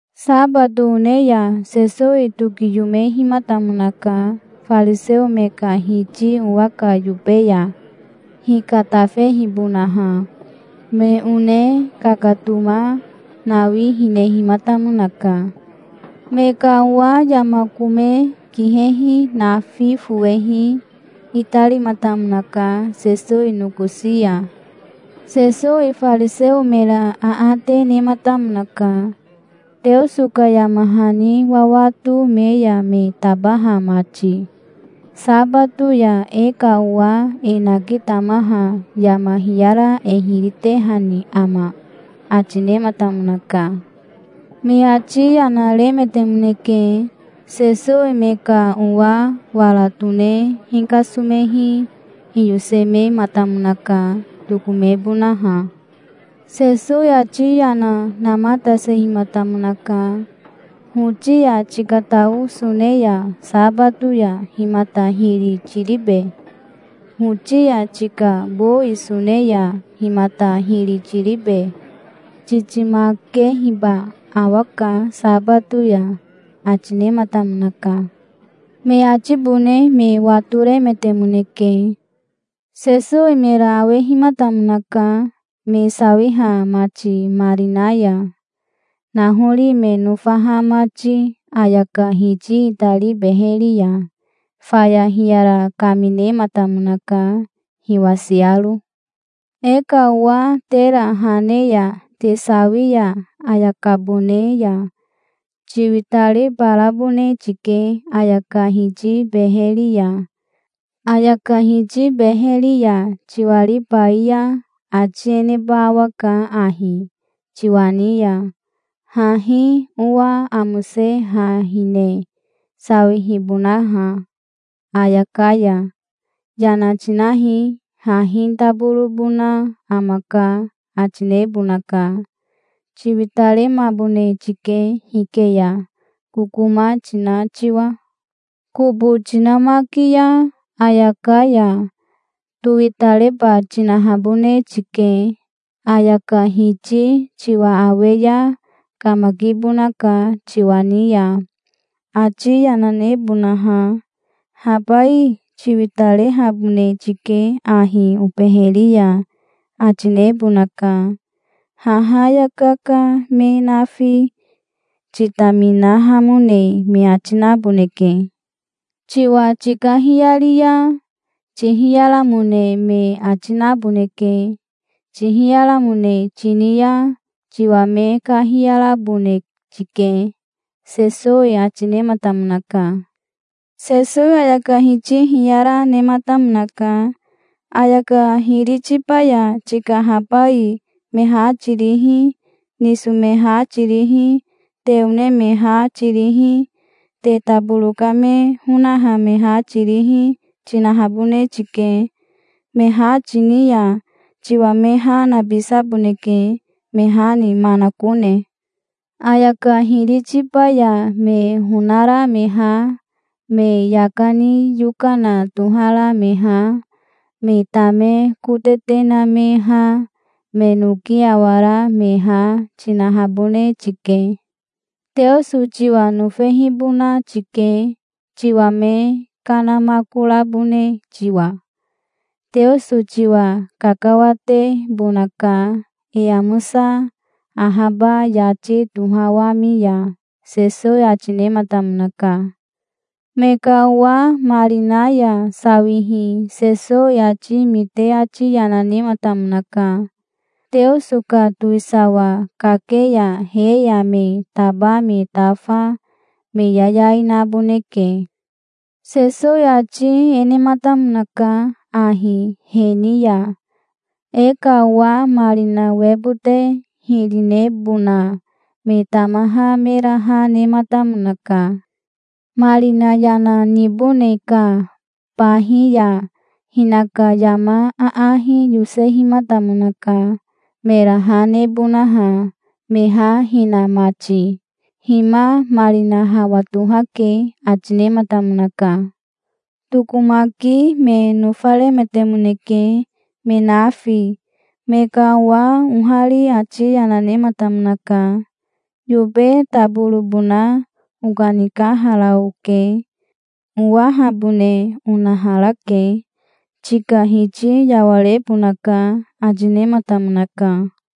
Sabato one ya Sesowi tokiyomehimatamonaka fariseo me ka hiti owa ka yobe ya, hikatafehibonaha. Me one kakatoma nawi hinehimatamonaka. Me ka owa yama kome kihehi nafi fowehi itarimatamonaka Sesowi nokosi ya. Sesowi fariseo mera aate nematamonaka, Teoso ka yama hani wawato me ya me tabaha mati. "Sabato ya e ka owa e nakitamaha yama hiyara e hiri tehani ama?" ati nematamonaka. Me ati yana remetemoneke. Sesowi me ka owa wara tone hikasomehi hiyosemematamonaka, tokomebonaha. Sesowi ati yana namatasehimatamonaka. "Hoti ya tikatao sone ya sabato ya himata hiri tiribe? Hoti ya tika bowi sone ya himata hiri tiribe? Titimakehiba awaka sabato ya", ati nematamonaka. Me atibone me watoremetemoneke. Sesowi mera awehimatamonaka, me sawiha mati marina ya, nahori me nofaha mati ayaka hiti itari beheri ya. Faya hiyara kaminematamonaka hiwasiaro. "E ka owa tera ha ne ya te sawi ya ayakabone ya tiwitaribarabone tike ayaka hiti beheri ya. Ayaka hiti beheri ya tiwaribai ya ati e neba awaka ahi tiwa ni ya, hahi owa amose ha hine, sawihibonaha ayaka ya. Yana tinahi, hahi taborobona amaka, ati nebonaka. Tiwitaremabone tike hike ya, kokoma tina tiwa. Kobo tinamaki ya ayaka ya towitareba tinahabone tike. Ayaka hiti tiwa awe ya kamakibonaka tiwa ni ya, ati yana nebonaha. 'Habai tiwitarehabone tike ahi obeheri ya', ati nebonaka. Haha ayaka ka me nafi titaminahamone me ati naboneke. Tiwa tikahiyari ya tihiyaramone me ati naboneke. Tihiyaramone tini ya tiwa me kahiyarabone tike", Sesowi ati nematamonaka. Sesowi ayaka hiti hiyara, nematamonaka. "Ayaka hiri tiba ya tika habai me ha tirihi, niso me ha tirihi, te one me ha tirihi, te taboro ka me honaha me ha tirihi, tinahabone tike. Me ha tini ya tiwa me ha nabisaboneke, me ha ni manakone. Ayaka hiri tiba ya me honara me ha, me yaka ni yokana tohara me ha, me tame kotete na me ha, me noki awara me ha, tinahabone tike. Teoso tiwa nofehibona tike, tiwa me kanamakorabone tiwa. Teoso tiwa kakawatebonaka, e amosa ahaba yati tohawami ya", Sesowi ati nematamonaka. Me ka owa marina ya sawihi Sesowi ati mite ati yana nematamonaka. "Teoso ka towisawa kake ya he ya me taba me tafa me yayai naboneke". Sesowi ati e nematamonaka ahi he ni ya: "E ka owa marina webote hiri nebona me tamaha mera ha nematamonaka. Marina yana nibone ka bahi ya hinaka yama aahi yosehimatamonaka mera ha nebonaha, me ha hina mati. 'Hima, marina hawa tohake', ati nematamonaka. Tokomaki me nofaremetemoneke me nafi. Me ka owa ohari ati yana nematamonaka. 'Yobe taborobona okanikahara oke. Owahabone onaharake. Tika hiti yawarebonaka', ati nematamonaka.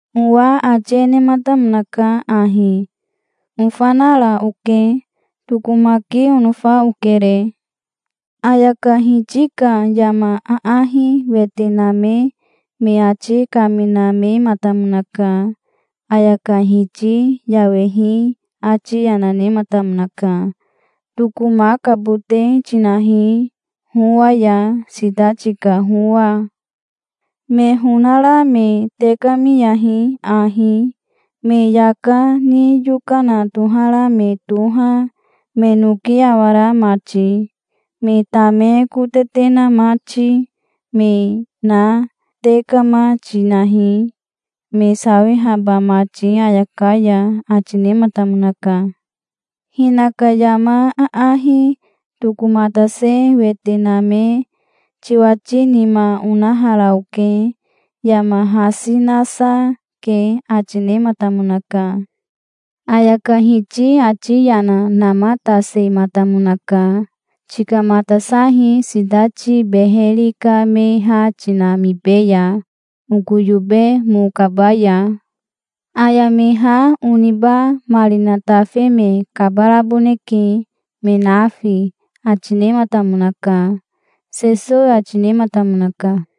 Owa ati e nematamonaka ahi: 'Ofanara oke. Tokomaki onofa okere'". "Ayaka hiti ka yama aahi wete name me ati kaminamematamonaka. Ayaka hiti yawehi ati yana nematamonaka. 'Tokomakabote tinahi howa ya, sitati ka howa. Me honara me tekamiyahi ahi. Me yaka ni yokana tohara me toha, me noki awara mati, me tame kotete na mati, me na tekama tinahi, me sawihaba mati ayaka ya', ati nematamonaka". "Hinaka yama aahi tokomatase wete name 'Tiwati nima onahara oke. Yama hasi nasa ke', ati nematamonaka". "Ayaka hiti ati yana namatasematamonaka. 'Tikamatasahi sitati beheri ka me ha tinamibeya, oko yobe mo kabaya. Aya me ha oniba marina tafe me kabaraboneke me nafi', ati nematamonaka", Sesowi ati nematamonaka.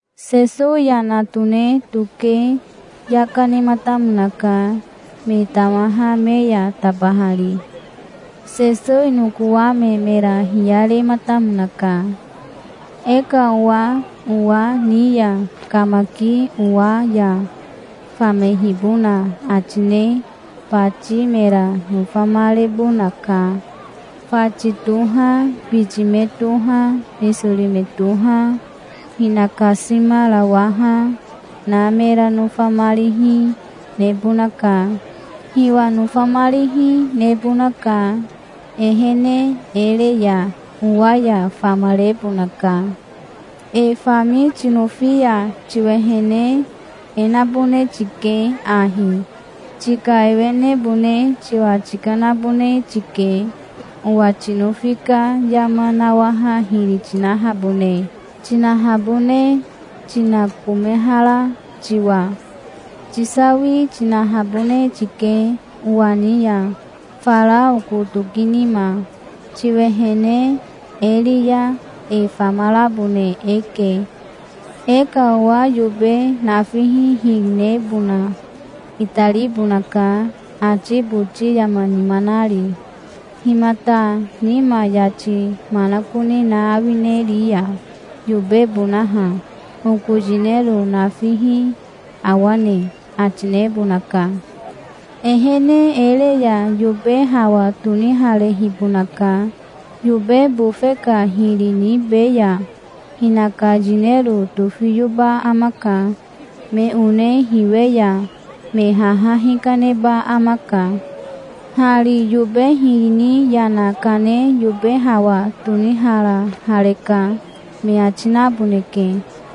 Sesowi yana tone toke yaka nematamonaka, me tamaha me ya tabahari. Sesowi nokowame mera hiyarematamonaka. "E ka owa owa ni ya kamaki owa ya famehibona ati ne bati mera nofamarebonaka. Fati toha, biti me toha, nisori me toha, hinakasimarawaha, na mera nofamarihi, nebonaka. Hiwa nofamarihi, nebonaka. Ehene e re ya owa ya famarebonaka. E fami tinofi ya tiwehene e nabone tike ahi: tika ewenebone tiwa tikanabone tike, owa tinofi ka yama nawaha hiri tinahabone tinakomehara tiwa. Tisawi tinahabone tike owa ni ya fara oko toki nima. Tiwehene e ri ya e famarabone eke". "E ka owa yobe nafihi hiri nebona itaribonaka, ati boti yama nima nari. 'Himata nima yati manakone na awineriya, yobebonaha? Oko yinero nafihi awane?' ati nebonaka. Ehene e re ya yobe hawa toniharehibonaka. Yobe bofe ka hiri nibe ya hinaka yinero tofiyoba amaka. Me one hiwe ya me haha hikaneba amaka. 'Hari yobe hiri ni yana kane yobe hawa toniharahareka', me ati naboneke".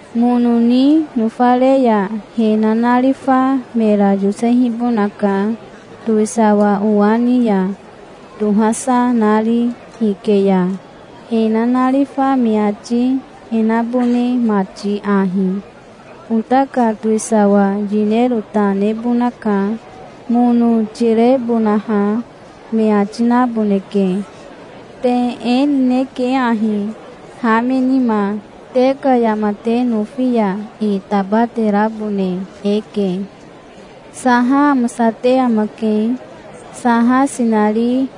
Mono ni nofare ya he nanarifa mera yosehibonaka, towisawa owa ni ya, tohasa nari hike ya, he nanarifa me ati e nabone mati ahi: 'Ota ka towisawa yinero ta nebonaka, mono tirebonaha', me ati naboneke. Te e nineke ahi, ha me nima. Te ka yama te nofi ya e tabaterabone eke". "Saha amosate amake. Saha sinari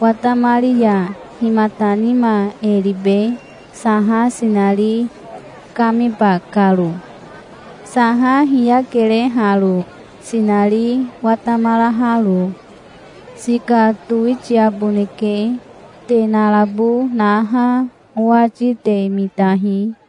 watamari ya himata nima e ribe, saha sinari kamiba karo? Saha hiyakere haro, sinari watamaraharo. Sika towitiaboneke. Te narabo naha owati te mitahi".